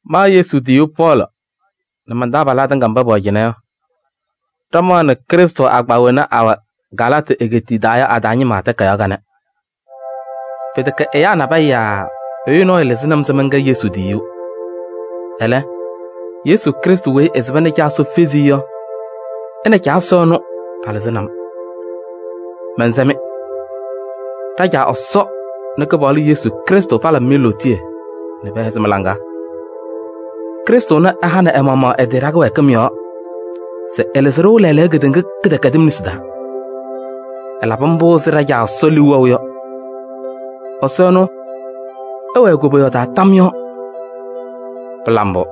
Ma Yesu tiyiyu Pɔɔlɩ nɛ man-taabalaa tɩŋa mba pɛwɛ cɩnɛ yɔ, ɖɩmaɣnɩ Krɩstʋ agbaa wena awɛ Galaatɩ egeetiye taa yɔ a-taa ñɩma takayaɣ kanɛ. Pɩtɛkɛ ɛyaa nabɛyɛ yaa ɛyʋ nɔɔyʋ lɩzɩnɩ-m se mɛnkɛ Yesu tiyiyu. Ɛlɛ, Yesu Krɩstʋ weyi ɛsɩba nɛ Caa Ɛsɔ fezi-i yɔ, ɛ nɛ Caa Ɛsɔ ɛnʋ, palɩzɩnɩ-m. Mɛnsɛ-mɩ: ɖa-Caa Ɛsɔ nɛ Kɩpaɣlʋ Yesu Krɩstʋ palabɩ-mɩ lootiye nɛ pɛhɛzɩ mɩ-laŋa. Krɩstʋ ɛnʋ ɛhanɩ ɛ-maɣmaɣ ɛ-tɩ ɖa-kɩwɛɛkɩm yɔɔ se ɛlɩzɩ-ɖʋ lɛɛlɛɛyɔ kedeŋa kɩdɛkɛdɩm nesi taa. Ɛlabɩ mbʋ ɛzɩ ɖa-Caa Ɛsɔ liu wɛʋ yɔ. Ɛsɔ ɛnʋ, ɛwɛɛ koboyaɣ taa tam yɔɔ! Pɩla mbʋ!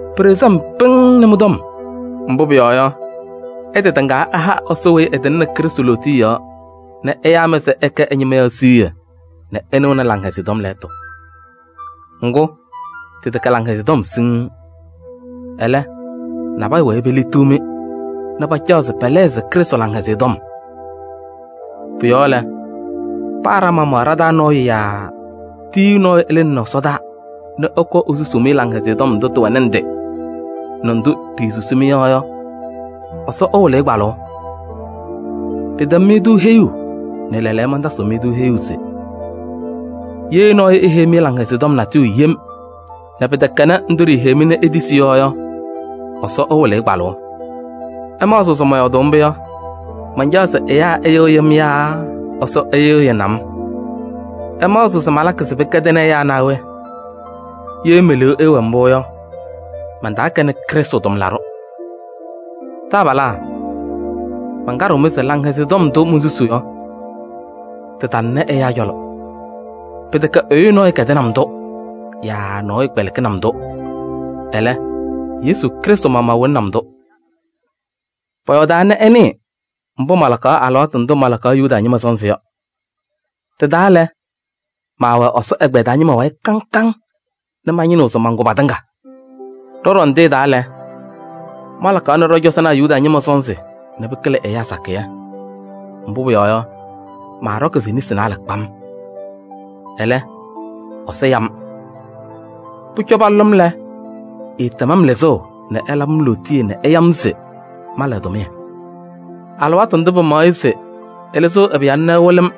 Pɩɖɩɣzɩ-m pɩŋŋ nɛ mɩ-tɔm. Mbʋ pʋyɔɔ yɔ, ɩtɩha Ɛsɔ weyi ɛtɩŋnɩ Krɩstʋ lootiye yɔɔ nɛ ɛyaa-mɩ se ɩkɛ ɛ-ñɩma yɔ siɣye nɛ ɩnɩɣnɩ Laŋhɛzɩyɛ Tɔm lɛɛtʋ. Ŋgʋ, tɩtɛkɛ Laŋhɛzɩyɛ Tɔm siŋŋ. Ɛlɛ, nabɛyɛ wɛɛ peliɣtiɣ-mɩ nɛ pacaɣ se pɛlɛɣzɩ Krɩstʋ Laŋhɛzɩyɛ Tɔm. Pʋ-yɔɔ lɛ, paa ɖa-maɣmaɣ ɖa-taa nɔɔyʋ yaa tiyiyu nɔɔyʋ ɛlɩnɩnɩ ɛsɔdaa nɛ ɛkɔɔ esusuu-mɩ Laŋhɛzɩyɛ Tɔm ndʋ tɩwɛ ndɩ nɛ ndʋ ɖisusi-mɩ yɔ yɔ, Ɛsɔ ɛwɩlɩ-ɩ kpalʋʋ! Ɖɩtɛm-mɩ-tʋ heyuu nɛ lɛɛlɛɛyɔ mantasɩɣ-mɩ-tʋ heyuu se: ye nɔɔyʋ eheyi-mɩ Laŋhɛzɩyɛ Tɔm natʋyʋ yem nɛ pɩtɛkɛnɩ ndʋ ɖiiheyi-mɩ nɛ itisi yɔ yɔ, Ɛsɔ ɛwɩlɩ-ɩ kpalʋʋ! Ɩmaɣzɩɣ se mɔyɔɔdʋʋ mbʋ yɔ, mancaɣ se ɛyaa ɩyɩɣyɩ-m yaa Ɛsɔ ɛyɩɣyɩnɩ-m? Ɩmaɣzɩɣ se malakɩ se pɩwɛɛ pɩkɛdɩɣnɩ ɛyaa naa we? Ye me-liu ɛɛwɛ mbʋ yɔ, mantaakɛnɩ Krɩstʋ tʋmlaɖʋ. Taabalaa! Mankaɖɩɣ-mɩ se Laŋhɛzɩyɛ Tɔm ndʋ monsusuu yɔ, tɩtalɩnɩ ɛyaa cɔlɔ. Pɩtɛkɛ ɛyʋ nɔɔyʋ kɛdɩnɩ-m-tʋ yaa nɔɔyʋ kpɛlɩkɩnɩ-m-tʋ, ɛlɛ, Yesu Krɩstʋ maɣmaɣ wɩlɩnɩ-m-tʋ. Pɔyɔɔdaa nɛ ɩnɩɩ mbʋ malakaɣ alɩwaatʋ ndʋ malakaɣ Yuda ñɩma sɔnzɩ yɔ. Tɩ-taa lɛ, maawɛ Ɛsɔ ɛgbɛyɛ taa ñɩma wayɩ kaŋ kaŋ nɛ mañɩnɩɣ se mankʋ patɩŋa. Ɖɔ-ɖɔndɩyɛ taa lɛ, malakaɣ ɖɔ-cɔzɔnaa Yuda ñɩma sɔnzɩ nɛ pɩkɩlɩ ɛyaa sakɩyɛ. Mbʋ pʋyɔɔ yɔ, maaɖɔkɩ-sɩ nesi naalɛ kpam. Ɛlɛ, Ɛsɔ ya-m. Pʋcɔ palʋlɩ-m lɛ, ɛɛtɛm-m lɩzʋʋ nɛ ɛlabɩ-m lootiye nɛ ɛya-m se mala ɛ-tʋmɩyɛ. Alɩwaatʋ ndʋ pɩmaɣ-ɩ se ɛlɩzɩɣ ɛ-Pɩyalʋ ɛwɩlɩ-m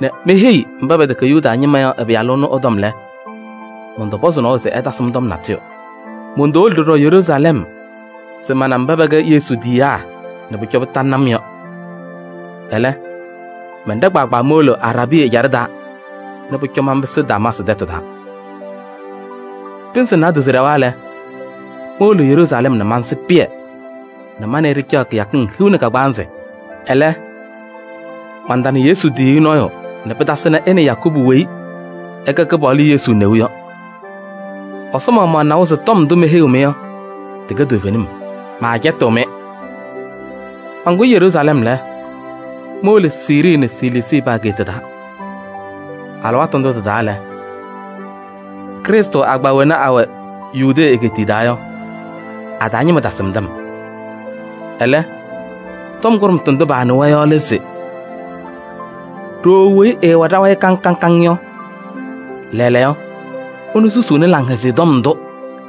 nɛ meheyi mba pɛtɛkɛ Yuda ñɩma yɔ ɛ-Pɩyalʋ ɛnʋ ɛ-tɔm lɛ, mɔntɔpɔzɩ nɔɔyʋ se ɛtasɩ-m tɔm natʋyʋ. Montowolo ɖɔɖɔ Yeruusalɛm se mana mba pɛkɛ Yesu tiyiyaa nɛ pʋcɔ pɩtalɩnɩ-m yɔ. Ɛlɛ, mɛnɖɛ kpaagbaa mowolo Araabii ɛjaɖɛ taa nɛ pʋcɔ manpɩsɩ Damaasɩ tɛtʋ taa. Pɩnzɩ naadozo ɖɛwa lɛ, mowolo Yeruusalɛm nɛ mansɩ Pɩyɛ nɛ ma nɛ ɩ ɖɩcaɣ kɩyakɩŋ hiu nɛ kagbaanzɩ. Ɛlɛ, mantana Yesu tiyiyu nɔɔyʋ nɛ pɩtasɩnɩ ɛ nɛ Yakubu weyi ɛkɛ Kɩpaɣlʋ Yesu neu yɔ. Ɛsɔ maɣmaɣ nawa se tɔm ndʋ meheyiɣ-mɩ yɔ tɩkɛ toovenim, maacɛtɩɣ-mɩ. Mankʋyɩ Yeruusalɛm lɛ, mowolo Siirii nɛ Siliisii pa-ageeta taa. Alɩwaatʋ ndʋ tɩ-taa lɛ, Krɩstʋ agbaa wena awɛ Yudee egeetiye taa yɔ, a-taa ñɩma tasɩmdɩ-m. Ɛlɛ, tɔm kʋɖʋmtʋ ndʋ paanɩwa yɔ lɛ se: “Ɖooo weyi ɛɛwɛ ɖa-wayɩ kaŋ kaŋ yɔ, lɛɛlɛɛyɔ, ɛnʋ susuuni Laŋhɛzɩyɛ Tɔm ndʋ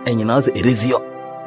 ɛñɩnaɣ se eɖezi yɔ.”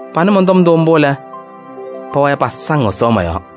Panɩ mɔn-tɔm ndʋ mbʋ lɛ, pɛwɛɛ pasaŋ Ɛsɔ mɔ-yɔɔ.